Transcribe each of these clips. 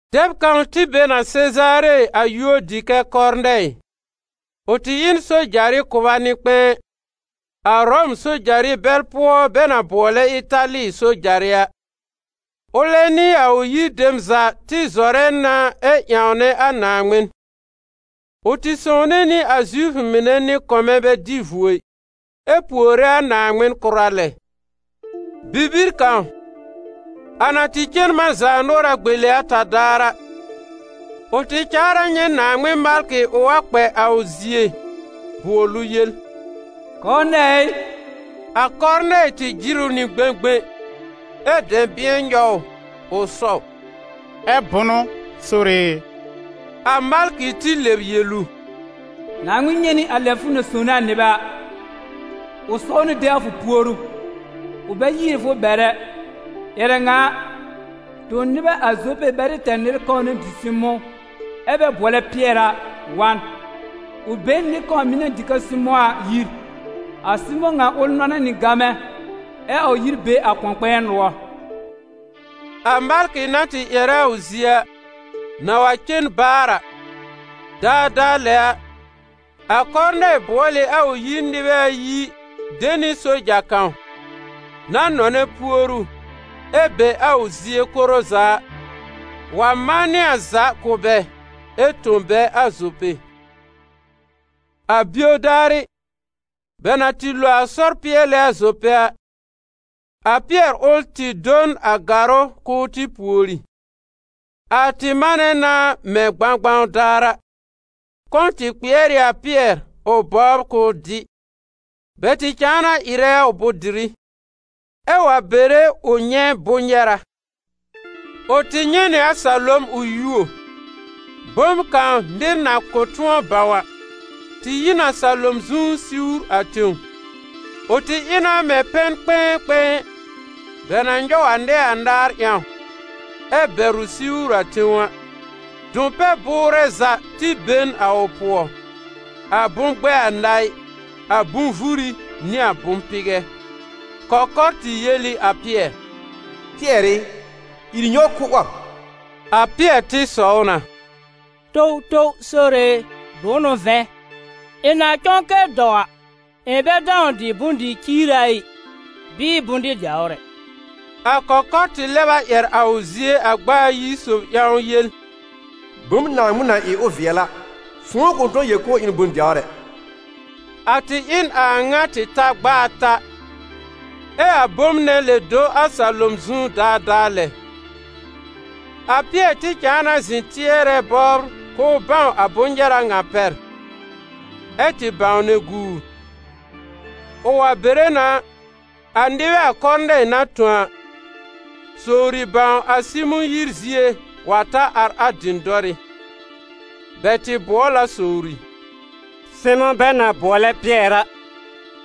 Dɛb kãw tɩ be n a Sezaare a yúor dɩ kɛ́ Kɔrnɛɩ. Ʋ tɩ ɩ n sojarɩ kʋba nɩ-kpɛ̃ɛ, a Ʋrɔm sojarɩ bɛl pʋɔ bɛ na bʋɔlɛ Ɩtali sojarɩ a. Ʋlɛ nɩ a ʋ yir dem za tɩ zɔrɛ na ɛ ƴãwnɛ a Naaŋmɩn; ʋ tɩ sõwne nɩ a Zifʋ mɩnɛ nɩ-kɔmɛ bɛ dɩ vuo ɩ, ɛ puore a Naaŋmɩn kʋra lɛ. Bibir kãw, a na tɩ cen man zaanʋɔra gbele ata daar a, ʋ tɩ caar a nyɛ̃ Naaŋmɩn malkɩ ʋ wa kpɛ a ʋ zie bʋɔl ʋ yel: «Kɔrnɛɩ ɩ!» A Kɔrnɛɩ tɩ jɩr ʋ nɩ gbẽgbẽ, ɛ́ dɛ̃bɩ̃ɛ nyɔw ʋ, ʋ sɔw: «Ɛ́ bʋnʋ, Sore e?» A malkɩ tɩ lɛb yel ʋ: «Naaŋmɩn nyɛ̃ nɩ a lɛ fʋ na sõwne a nɩbɛ a, ʋ saw na de a fʋ puoru, ʋ bɛ yiiri fʋ bɛr ɛ. Ƴɛrɛ ŋa a, tõ nɩbɛ a Zope bɛ tɩ tɛr nɩr kãw na dɩ Sɩmʋ̃, ɛ́ bɛ bʋɔlɛ Pɩɛr a, wa n. Ʋ be n nɩr kãw mɩ̀ na dɩ kɛ Sɩmʋ̃ a yir. A Sɩmʋ̃ ŋa ʋl nɔnɛ́ nɩ gamɛ ɛ a ʋ yir be a kʋ̃ɔ-kpɛ̃ɛ nʋɔr.» A malkɩ na tɩ ƴɛrɛ a ʋ zie a, na wa cen baar a, daadaa lɛ a, a Kɔrnɛɩ bʋɔl ɩ a ʋ yir nɩbɛ ayi de nɩ soja kãw, na nɔnɛ puoru ɛ be a ʋ zie koro za a, wa manɩ a za kʋ̀ bɛ ɛ tõ bɛ a Zope. A bio daarɩ, bɛ na tɩ lo a sɔr pɩɛlɛ a Zope a, a Pɩɛr ʋl tɩ do n a gàrʋ́ k'ʋʋ tɩ pùori. A tɩ manɛ na mɛ̃ gbãgbãw daar a. Kɔ̃ tɩ kpɩɛr ɩ a Pɩɛr ʋ bɔbr k'ʋʋ dɩ. Bɛ tɩ cãa na ɩrɛ a ʋ bʋ̃-dɩrɩ, ɛ wa bere ʋ nyɛ̃ bʋ̃-nyɛra. Ʋ tɩ nyɛ̃ nɩ a salom ʋ yuo; bom kãw nɩr na kʋ̃ tʋ̃ɔ bãw a, tɩ yi n a salom zu siwr a tẽw. Ʋ tɩ ɩ na mɛ̃ pɛn-kpɛ̃ɛ-kpɛ̃ɛ, bɛ na nyɔw a nɛɛ anaar ƴãw, ɛ bɛr ʋ siwr a tẽw a. Dʋ̃-pɛ-bʋʋrɛ za tɩ be n a ʋ pʋɔ: a bʋ̃-gbɛɛ anaɩ, a bʋ̃-vuri nɩ a bʋ̃-pɩgɛ. Kɔkɔr tɩ yel ɩ a Pɩɛr: «Pɩɛr ɩ, ìr nyɔw kʋ́ 'wɔb!» A Pɩɛr tɩ sɔw na: «Towtow Sore e, bʋ̃ʋ n'ʋ vɛ̃, ɩ̃ na cɔ̃ kɛ dɔw a, ɩ̃ bɛ dãw dɩ bʋ̃-dɩ-ciira ɩ, bɩɩ bʋ̃-dɩ-dɛwr ɛ.» A kɔkɔr tɩ lɛb a ƴɛr a ʋ zie a gb'a ayi sob ƴãw yel: «Bom Naaŋmɩn na ɩ ʋ vɩɛl a, fʋ̃ʋ kʋ̃ tʋ̃ɔ yel k'ʋʋ ɩ n bʋ̃-dɛwr ɛ!» A tɩ ɩ n a a ŋa tɩ ta gb'a ata, ɛ a bom nɛ lɛb do a salom zu daadaa lɛ. A Pɩɛr tɩ cãa na zɩ̃ tɩɛrɛ bɔbr k'ʋʋ bãw a bʋ̃-nyɛra ŋa pɛr, ɛ tɩ bãwnɛ guur. Ʋ wa bere na, a nɩbɛ a Kɔrnɛɩ na tõ a, sowri bãw a Sɩmʋ̃ yir zie wa ta ar a dɩ̃dɔrɩ́. Bɛ tɩ bʋɔl a sowri: «Sɩmʋ̃ bɛ na bʋɔlɛ Pɩɛr a,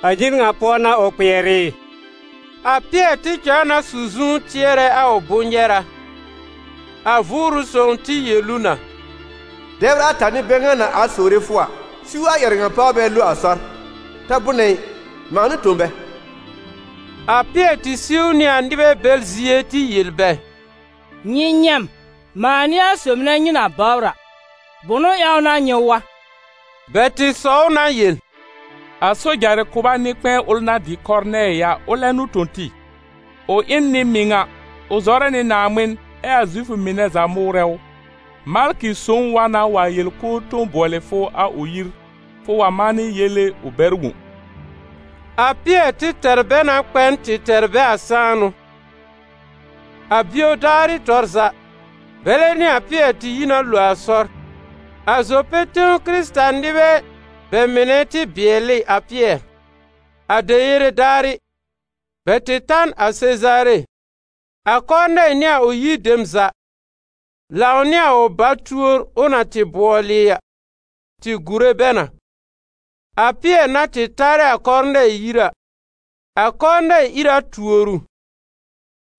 a yir ŋa pʋɔ n'a ʋ kpɩɛr ɩ?» A Pɩɛr tɩ cãa na su zu tɩɛrɛ a ʋ bʋ̃-nyɛra. A Vʋʋrʋ Sõw tɩ yel ʋ na: «Dɛbr ata n'ɩ bɛ ŋa na ar sowre fʋ a, siw a ƴɛrɛ ŋa páw bɛ lo a sɔr. Ta bʋnɛ ɩ, mãa n'ʋ tõ bɛ.» A Pɩɛr tɩ siw nɩ a nɩbɛ bɛl zie tɩ yel bɛ: «Nyɩ nyɛ̃ m. Mãa n'ɩ a sob nɛ nyɩ na bɔbr a. Bʋ̃ʋ ƴãw n'a nyɩ wa?» Bɛ tɩ sɔw na yel: «A sojarɩ kʋba nɩ-kpɛ̃ɛ ʋl na dɩ Kɔrnɛɩ a, ʋlɛ n'ʋ tõ tɩ. Ʋ ɩ n nɩ-mɩŋa, ʋ zɔrɛ nɩ Naaŋmɩn, ɛ a Zifʋ mɩnɛ za mʋʋrɛ ʋ. Malkɩ sõw wa na wa yel k'ʋʋ tõ bʋɔlɩ fʋ a ʋ yir, fʋ wa manɩ yele ʋ bɛr wõ.» A Pɩɛr tɩ tɛr bɛ na kpɛ n tɩ tɛr bɛ a sãanʋ. A bio daarɩ tɔr za, bɛlɛ nɩ a Pɩɛr tɩ yi na lo a sɔr. A Zope tẽw Kɩrɩta-nɩbɛ bɛ mɩnɛ tɩ bɩɛl ɩ a Pɩɛr. A deyere daarɩ, bɛ tɩ ta n a Sezaare. A Kɔrnɛɩ nɩ a ʋ yir dem za, lãw nɩ a ʋ ba-túor ʋ na tɩ bʋɔlɩ a, tɩ gùre bɛ na. A Pɩɛr na tɩ tarɛ a Kɔrnɛɩ yir a, a Kɔrnɛɩ ìr a tuor ʋ,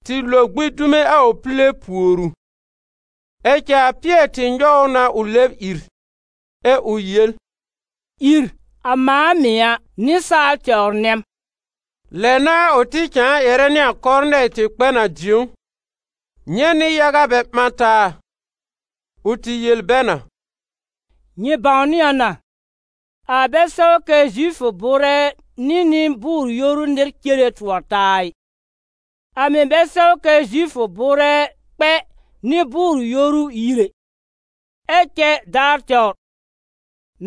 tɩ lo gbĩ dume a ʋ pile pùor ʋ. Ɛ cɛ a Pɩɛr tɩ nyɔw ʋ na ʋ lɛb ìr, ɛ ʋ yel: «Ìr, a mãa mɩ̀ a, nɩsaal tɛwr nɛ m.» Lɛ n'a ʋ tɩ cãa ƴɛrɛ nɩ a Kɔrnɛɩ tɩ kpɛ n a dĩ̀ó, nyɛ̃ nɩ-yaga bɛ ɓã taa. Ʋ tɩ yel bɛ na: «Nyɩ bãwnɩ a na, a bɛ sɛw kɛ Zifʋ bʋʋrɛ nɩ nɩ-bʋʋr-yoru nɩr cere tʋɔr taa ɩ; a mɩ̀ bɛ sɛw kɛ Zifʋ bʋʋrɛ kpɛ nɩ-bʋʋr-yoru yir ɛ. Ɛ cɛ daar tɛwr,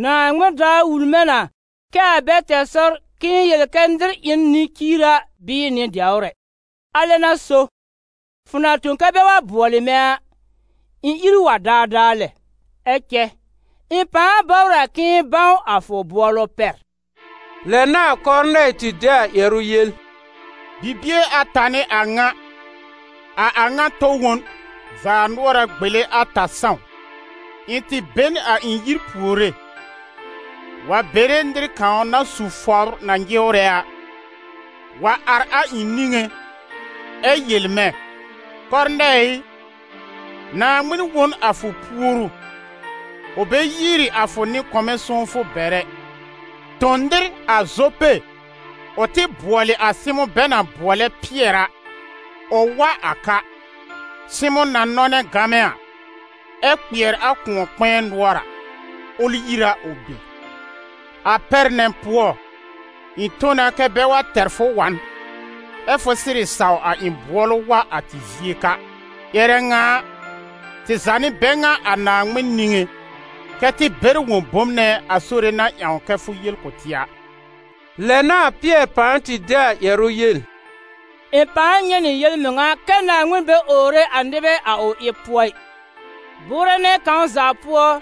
Naaŋmɩn daar wul mɛ̃ na kɛ a bɛ tɛr sɔr k'ɩ̃ɩ yel kɛ́ nɩr ɩ n nɩ-ciira bɩɩ nɩ-dɛwr ɛ. Alɛ n'a so, fʋ na tõ kɛ́ bɛ bʋɔlɩ mɛ̃ a, ɩ̃ ìr wa daadaa lɛ. Ɛ cɛ ɩ̃ pãa bɔbr a k'ɩ̃ɩ bãw a fʋ bʋɔlʋ pɛr.» Lɛ n'a a Kɔrnɛɩ tɩ de a ƴɛrʋ yel: «Bibie ata n'ɩ a ŋa, a a ŋa tɔ wõn, zaanʋɔra gbele ata sãw, ɩ̃ tɩ be n a ɩ̃ yir puore, wa bere nɩr kãw na su fɔbr na nyɩwrɛ a, wa ar a ɩ̃ niŋé, ɛ yel mɛ̃: ‹Kɔrnɛɩ ɩ, Naaŋmɩn wõ n a fʋ puoru, ʋ bɛ yiiri a fʋ nɩ-kɔmɛ sõwfʋ bɛr ɛ. Tõ nɩr a Zope ʋ tɩ bʋɔlɩ a Sɩmʋ̃ bɛ na bʋɔlɛ Pɩɛr a, ʋ wa a ka. Sɩmʋ̃ na nɔnɛ́ gamɛ a, ɛ́ kpɩɛr a kʋ̃ɔ-kpɛ̃ɛ nʋɔr a, ʋl yir a ʋ be.› A pɛr nɛ pʋɔ, ɩ̃ tõ na kɛ́ bɛ wa tɛr fʋ wa n, ɛ́ fʋ sɩrɩ saw a ɩ̃ bʋɔlʋ wa a tɩ zie ka. Ƴɛrɛ ŋa a, tɩ za n'ɩ bɛ ŋa a Naaŋmɩn niŋé, kɛ́ tɩ bɛr wõ bom nɛ a Sore na ƴãw kɛ́ fʋ yel kʋ̀ tɩ a.» Lɛ n'a a Pɩɛr pãa tɩ de a ƴɛrʋ yel: «Ɩ̃ pãa nyɛ̃ nɩ yel-mɩŋa kɛ́ Naaŋmɩn bɛ owre a nɩbɛ a ʋ ɩb pʋɔ ɩ: bʋʋrɛ nɛ kãw za pʋɔ,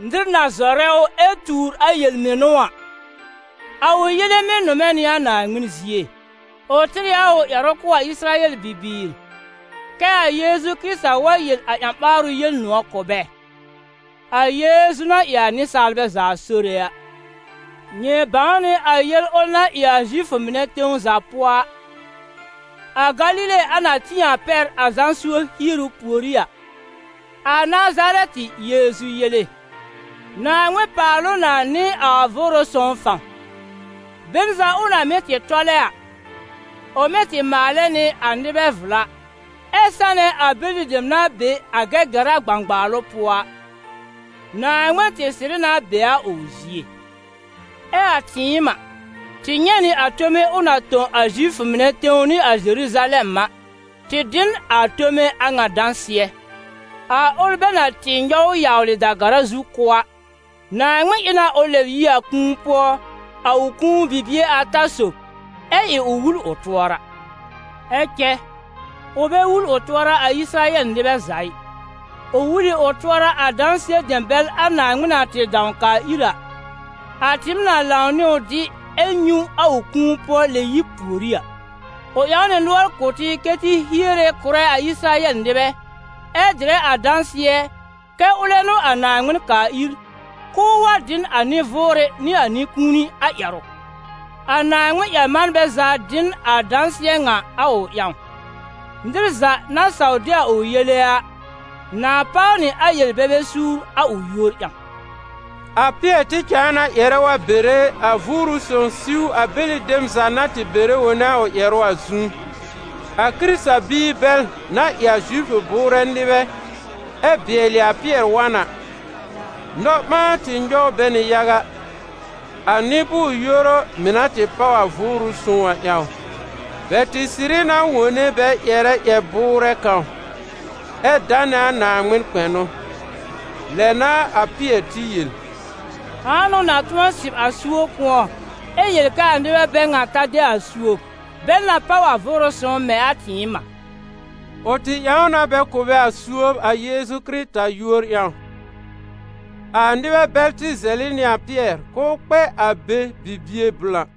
nɩr na zɔrɛ ʋ ɛ tuur a yel-mɩnʋ a, a ʋ yele mɩ́ nʋmɛ nɩ a Naaŋmɩn zie. Ʋ tɩr ɩ a ʋ ƴɛrʋ kʋ̀ a Ɩsɩrayɛl bibiir, kɛ a Yeezu Kɩrɩta wa yel a ƴã-ɓaarʋ Yel-nʋ̃ɔ̀ kʋ̀ bɛ: a Yeezu na ɩ a nɩsaalbɛ za Sore a. Nyɩ bãw nɩ a yel ʋl na ɩ a Zifʋ mɩnɛ tẽw za pʋɔ a, a Galile a na tĩ a pɛr a Zã suob hieru pùorí a: a Nazarɛtɩ Yeezu yele, Naaŋmɩn paal ʋ na nɩ a Vʋʋrʋ Sõw fãw. Be n za ʋ na mɩ́ tɩ tɔlɛ a, ʋ mɩ́ tɩ maalɛ nɩ a nɩbɛ vla, ɛ́ sanɛ a bɛlɩ dem na be a Gɛgɛra gbãgbaalʋ pʋɔ a. Naaŋmɩn tɩ sɩrɩ na be a ʋ zie. Ɛ a tɩɩm a, tɩ nyɛ̃ nɩ a tome ʋ na tõ a Zifʋ mɩnɛ tẽw nɩ a Zeruzalɛm a, tɩ dɩ n a tome a ŋa dãsɩɛ. A ʋl bɛ na tɩ nyɔw yawlɩ da-gara zu kʋ́ a, Naaŋmɩn ɩ na ʋ lɛb yi a kũu pʋɔ, a ʋ kũu bibie ata sob, ɛ ɩ ʋ wul ʋ tʋɔra. Ɛ cɛ ʋ bɛ wul ʋ tʋɔra a Ɩsɩrayɛl nɩbɛ za ɩ, ʋ wul ɩ ʋ tʋɔra a dãsɩɛ dem bɛl a Naaŋmɩn na tɩ dãw kaa ir a, a tɩɩm na lãw nɩ ʋ dɩ ɛ nyũ a ʋ kũu-pʋɔ-lɛb-yib pùorí a. Ʋ ƴãw nɩ nʋɔr kʋ̀ tɩ kɛ́ tɩ hiere kʋ̀rɛ a Ɩsɩrayɛl nɩbɛ, ɛ dɩrɛ a dãsɩɛ kɛ́ ʋlɛ n'ʋ a Naaŋmɩn kaa ir, k'ʋʋ wa dɩ n a nɩ-vʋʋrɩ nɩ a nɩ-kũuni a ƴɛrʋ. A Naaŋmɩn-ƴɛr-manbɛ za dɩ n a dãsɩɛ ŋa a ʋ ƴãw: nɩr za, na saw de a ʋ yele a, na páw nɩ a yel-bebe suur a ʋ yúor ƴãw.» A Pɩɛr tɩ cãa na ƴɛrɛ wa bere, a Vʋʋrʋ Sõw siw a bɛlɩ dem za na tɩ bɛrɛ wone a ʋ ƴɛrʋ a zu. A Kɩrɩta-biir bɛl na ɩ a Zifʋ bʋʋrɛ nɩbɛ ɛ bɩɛlɩ a Pɩɛr wa n a, nɔ-ɓãa tɩ nyɔw bɛ nɩ yaga, a nɩ-bʋʋr-yoru mɩ̀ na tɩ páw a Vʋʋrʋ Sõw a ƴãw. Bɛ tɩ sɩrɩ na wone bɛ ƴɛrɛ ƴɛr-bʋʋrɛ kãw, ɛ danɛ a Naaŋmɩn kpɛnʋ. Lɛ n'a a Pɩɛr tɩ yel: «Ãa n'ʋ na tʋ̃ɔ sɩb a suob kʋ̃ɔ, ɛ yel kɛ a nɩbɛ bɛ ŋa ta de a suob, bɛl na páw a Vʋʋrʋ Sõw mɛ̃ a tɩɩm a?» Ʋ tɩ ƴãw na bɛ kʋ̀ bɛ a suob a Yeezu Kɩrɩta yúor ƴãw. A nɩbɛ bɛl tɩ zɛlɩ nɩ a Pɩɛr k'ʋʋ kpɛ a be bibie blã.